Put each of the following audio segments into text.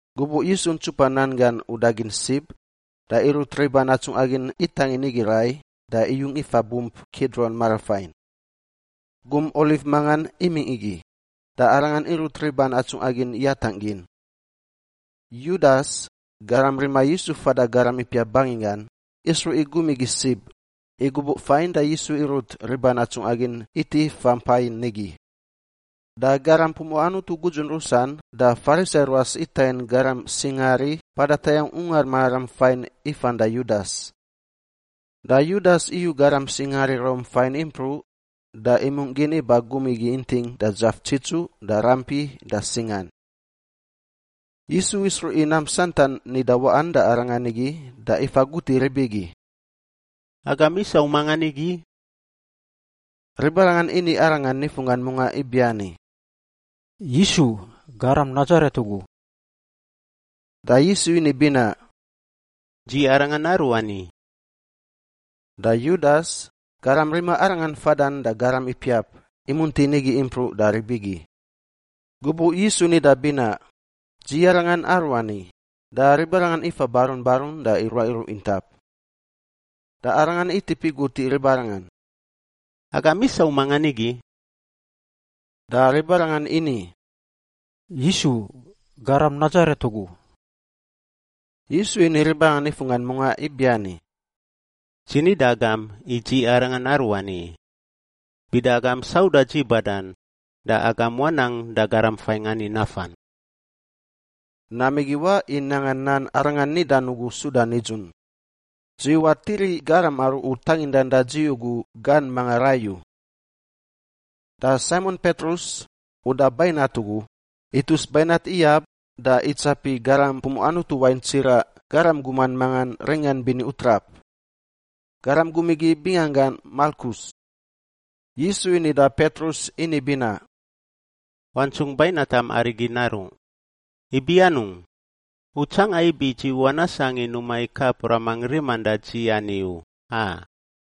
Gubuꞌ Yisu ntsupa nan gan uda gin sib, da irut riban atsungꞌa gin itangin nigi rai da iyung ifa bump Kidron marafain. Gum oliv mangan imingꞌ igi, da Arangan irut riban atsungꞌa gin yatangꞌ gin. Yudas, garam rima Yisu fada garam ipiap banginggan, isruꞌ i gum igi sib, i gubuꞌ fain da Yisu irut riban atsungꞌa gin iti ifa mpa nigi. Da garam pumuꞌa Anutu gudzun rusan da Farisai ruas itangin garam singaari mpada tayangꞌ Ungar Mararam fain ifan da Yudas. Da Yudas iyu garam singaari Rom fain impruꞌ da imungꞌ gin iba gum igi inting da dzaf tsitsuꞌ da rampi da singan. Yisu isruꞌ i nam santan nida waꞌan da Arangan igi da ifa gut i rib igi, “Agam isau mangan nigi?” Ribarangan ini Arangan nifunggan mungaꞌ ibiani, “Yisu, Garam Nasaret ugu.” Da Yisu ini binaꞌ, “Dzi Arangan Aruani.” Da Yudas, garam rima Arangan fadan da garam ipiap, imunti nigi impruꞌ da rib igi. Gubuꞌ Yisu nida binaꞌ, “Dzi Arangan Aruani,” da ribarangan ifa barun barun da iruaꞌ iruꞌ intap. Da Arangan itip igut i ribarangan, “Agam isau mangan nigi?” Da ribarangan ini, “Yisu, Garam Nasaret ugu.” Yisu ini ribarangan nifunggan mungaꞌ ibiani, “Dzi ni da agam i Dzi Arangan Aruani! Bida agam sauda dzi badan da agam wanang da garam fain ani nafan.” Nam igi waꞌ i nanga nan Arangan nidan ugu suda nidzun: “Dzi watiri garam aru U tangindan da dzi ugu gan manga rai u.” Da Saimon Petrus, uda bainat ugu, itus bainat iyab da itsapi garam pumuꞌa Anutu wain tsiraꞌ garam guman mangan ringan bini utrap. Garam gum igi binganggan Malkus. Yisu ini da Petrus ini binaꞌ, “Wantsungꞌ bainatam arigi naruꞌ! Ibi anungꞌ? U tsanga ibi dzi wanasangꞌ i numa i kap Ramangꞌ riman da dzi ani u, a?”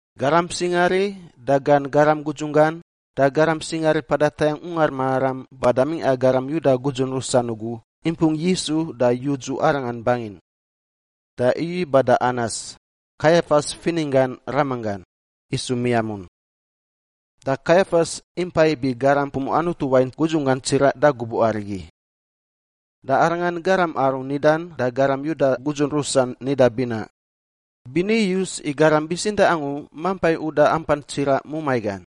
Garam singaari da gan garam gudzun gan da garam singaari mpada tayangꞌ Ungar Mararam bada mingꞌa garam Yuda gudzun rusan ugu impung Yisu da yudzu Arangan bangin. Da iyu iba da Anas, Kaiafas fininggan ramanggan, isu miamun. Da Kaiafas impa ibi garam pumuꞌa Anutu wain gudzunggan tsiraꞌ da gubuꞌ arigi. Da arangan garam aru nidan da garam Yuda gudzun rusan nida binaꞌ, “Bini iyus i garam bitsintaꞌ angu mampa i uda ampan tsiraꞌ mumai gan.”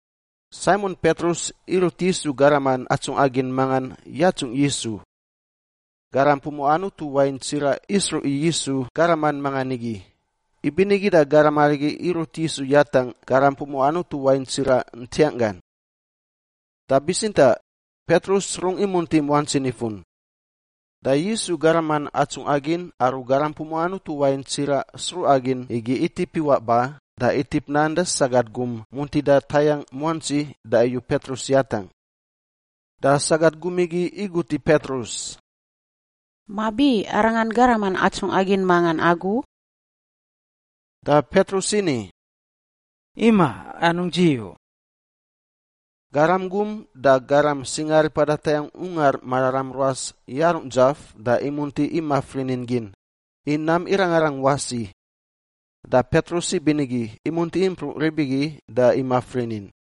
Saimon Petrus irut Yisu garaman atsungꞌa gin mangan yatsungꞌ Yisu. Garam pumuꞌa Anutu wain tsiraꞌ isruꞌ i Yisu garaman mangan nigi, ibinigi da garam arigi irut Yisu yatangꞌ garam pumuꞌa Anutu wain tsiraꞌ ntiang gan. Da bitsintaꞌ Petrus rungꞌ imunti muantsi nifun. Da Yisu garaman atsungꞌa gin aru garam pumuꞌa Anutu wain tsiraꞌ sruꞌa gin igi itip iwaꞌ ba da itip nan da sagat gum muntida tayangꞌ muantsi da iyu Petrus yatangꞌ. Da sagat gum igi igut i Petrus, “Mabi arangan garaman atsungꞌa gin mangan agu?” Da Petrus ini, “Imaꞌ! Anungꞌ dzi u.” Garam gum da garam singaari mpada tayangꞌ Ungar Mararam ruas yarungꞌ dzaf da imunti imaf rinin gin, i nam irangarang wasi. Da Petrus ibinigi imunti impruꞌ rib igi da imaf rinin.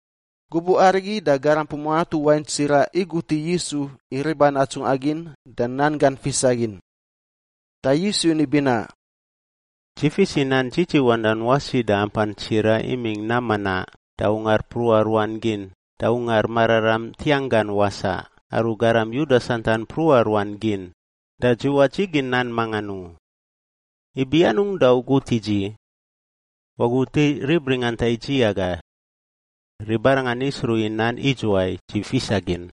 Gubuꞌ arigi da garam pumuꞌa Anutu wain tsiraꞌ igut i Yisu i riban atsungꞌa gin da nan gan fisa gin. Da Yisu ini binaꞌ, “Dzi fis i nan dzidziwandan wasi da ampan tsiraꞌ imingꞌ nam manaꞌ da ungar mpruꞌa ruan gin da Ungar Mararam ntiangꞌ gan wasaꞌ aru garam Yuda santan mpruꞌa ruan gin, da dzi wadzigin nan mangan u. Ibi anungꞌ da u gut i dzi? Wagut i rib ringanta i dzi aga. Ribarangan isruꞌ i nan idzuwai dzi fisa gin.”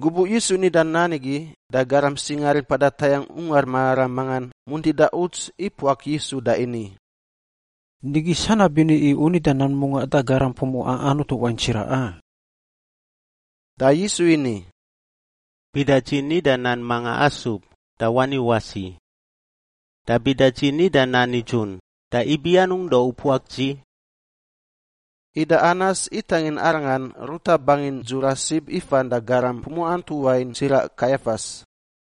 Gubuꞌ Yisu nida nan igi da garam singaari mpada tayangꞌ Ungar Mararam mangan muntida uts ipuak Yisu da ini, “Nigi sanab bini i u nida nan mungaꞌ da garam pumuꞌa Anutu wain tsiraꞌ, a?” Da Yisu ini, “Bida dzi nida nan manga asub da wani wasi! Da bida dzi nida nan nidzun, da ibi anungꞌ da u puak dzi?” Ida Anas itangin Arangan ruta bangin dzura sib ifan da garam pumuꞌa Anutu wain tsiraꞌ Kaiafas.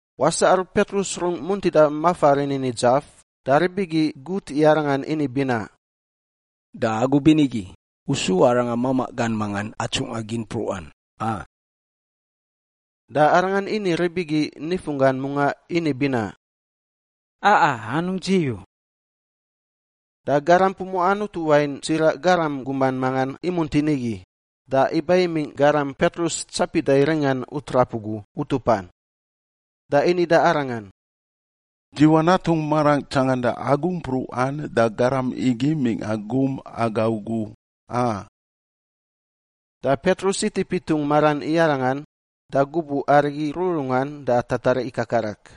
Wasaꞌ aru Petrus rungꞌ muntida mafa rinin i dzaf, da rib igi gut i arangan ini binaꞌ, “Da agu binigi, u su arangan mamaꞌ gan manga atsungꞌa gin mpruꞌan, a?” Da arangan ini rib igi nifunggan mungaꞌ ini binaꞌ, “Aꞌa! Anungꞌ dzi u!” Da garam pumuꞌa Anutu wain tsiraꞌ garam guman mangan imunti nigi, da iba imingꞌ garam Petrus tsapida i ringan utrap ugu utupan. Da ini da arangan, “Dzi wanatungꞌ marangꞌ tsanganda agu mpruꞌan da garam igi mingꞌa gum aga ugu, a?” Da Petrus itip itungꞌ maran i arangan, da gubuꞌ arigi rururungan da tatariꞌ ikakarak.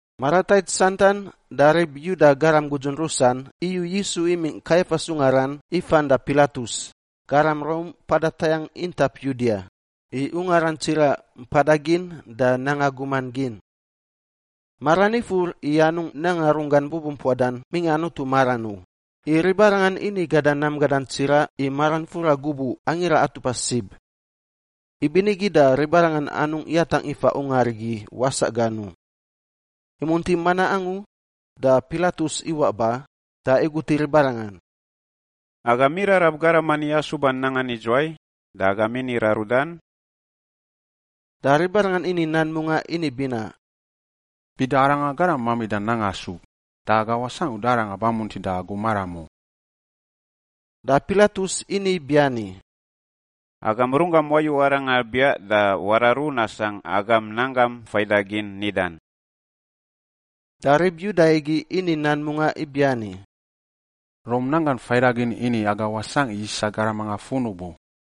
Maratait santan da rib Yuda garam gudzun rusan iyu Yisu imingꞌ Kaiafas ungaran ifan da Pilatus, garam Rom mpada tayangꞌ intap Yudia, i ungaran tsiraꞌ mpada gin da nanga guman gin. Maran ifur i anungꞌ nanga runggan bubumpuadan mingꞌa Anutu maran u, i ribarangan ini gada nam gadan tsiraꞌ i maran fura gubuꞌ Angira Atupa Sib. Ibinigi da ribarangan anungꞌ yatangꞌ ifa ungar igi wasaꞌ gan u. Imunti manaꞌ angu da Pilatus iwaꞌ ba da igut i ribarangan, “Agam irarab garam ani asuban nangan idzuwai da agam ini rarudan?” Da ribarangan ini nan mungaꞌ ini binaꞌ, “Bida aranga garam mamida nanga asub, da aga wasangꞌ uda aranga bamuntida agu maram u.” Da Pilatus ini biani, “Agam runggam wayu aranga biaꞌ da wararu nasangꞌ agam nan gam faidagin nidan.” Da rib Yuda igi ini nan mungaꞌ ibiani, “Rom nan gan faidagin ini aga wasangꞌ i isa garam mangan funub u.”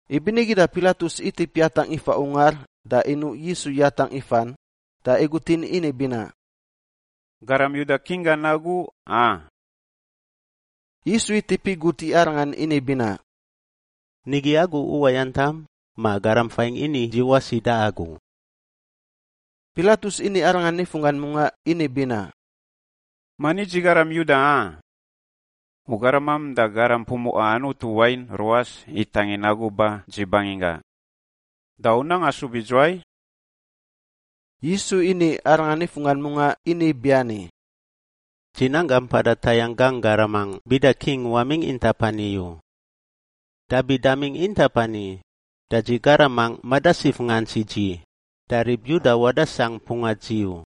Ibinigi da Pilatus itip yatangꞌ ifa ungar da inuꞌ Yisu yatangꞌ ifan da igutin ini binaꞌ, “Garam Yuda King gan agu, a?” Yisu itip igut i arangan ini binaꞌ, “Nigi agu uwayantam ma garam fain ini dzi wasi da agu?” Pilatus ini Arangan nifunggan mungaꞌ ini binaꞌ, “Mani dzi garam Yuda, a? U garamam da garam pumuꞌa Anutu wain ruas itangin agu ba dzi banginggangꞌ. Da u nang asub idzuwai?” Yisu ini arangan nifunggan mungaꞌ ini biani, “Dzi nanggangꞌ mpada tayangꞌ gangꞌ garamangꞌ bida king wamingꞌ intap ani u. Dabi damingꞌ intap ani, da dzi garamangꞌ madasif ngants i dzi, da rib Yuda wadasangꞌ mpunga dzi u.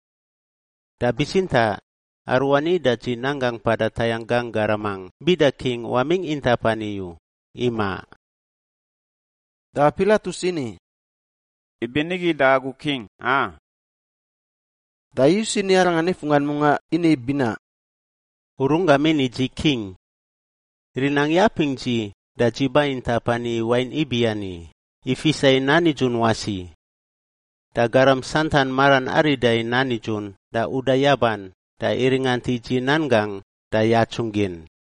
Da bitsintaꞌ aruani da dzi nanggangꞌ mpada tayangꞌ gangꞌ garamangꞌ bida king wamingꞌ intap ani u, imaꞌ.” Da Pilatus ini, “Ibinigi da agu king, a?” Da Yisu ini arangan nifunggan mungaꞌ ini binaꞌ, “U runggam ini i dzi king. Rinangꞌ yapingꞌ dzi da dzi ba intap ani i wain ibiani, i fisa i nan nidzun wasi. Da garam santan maran arida i nan nidzun da uda yaban, da iringant i dzi nan gangꞌ da yatsungꞌ gin.”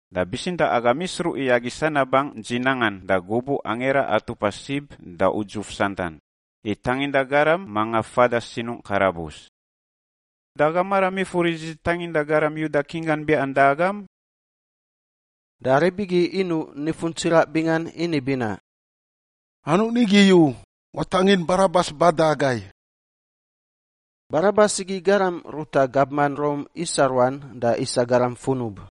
Da bitsintaꞌ agam isruꞌ i agi sanabangꞌ dzi nangan da gubuꞌ Angira Atupa Sib da udzuf santan, i tanginda garam manga fada sinungꞌ karabus. Da agam maram ifur i dzi tanginda garam Yuda king gan biaꞌan da agam?” Da rib igi inuꞌ nifun tsiraꞌ bingan ini binaꞌ, “Anungꞌ nigi u! Watangin Barabas ba da agai!” Barabas igi garam ruta gabman Rom isa ruan da isa garam funub.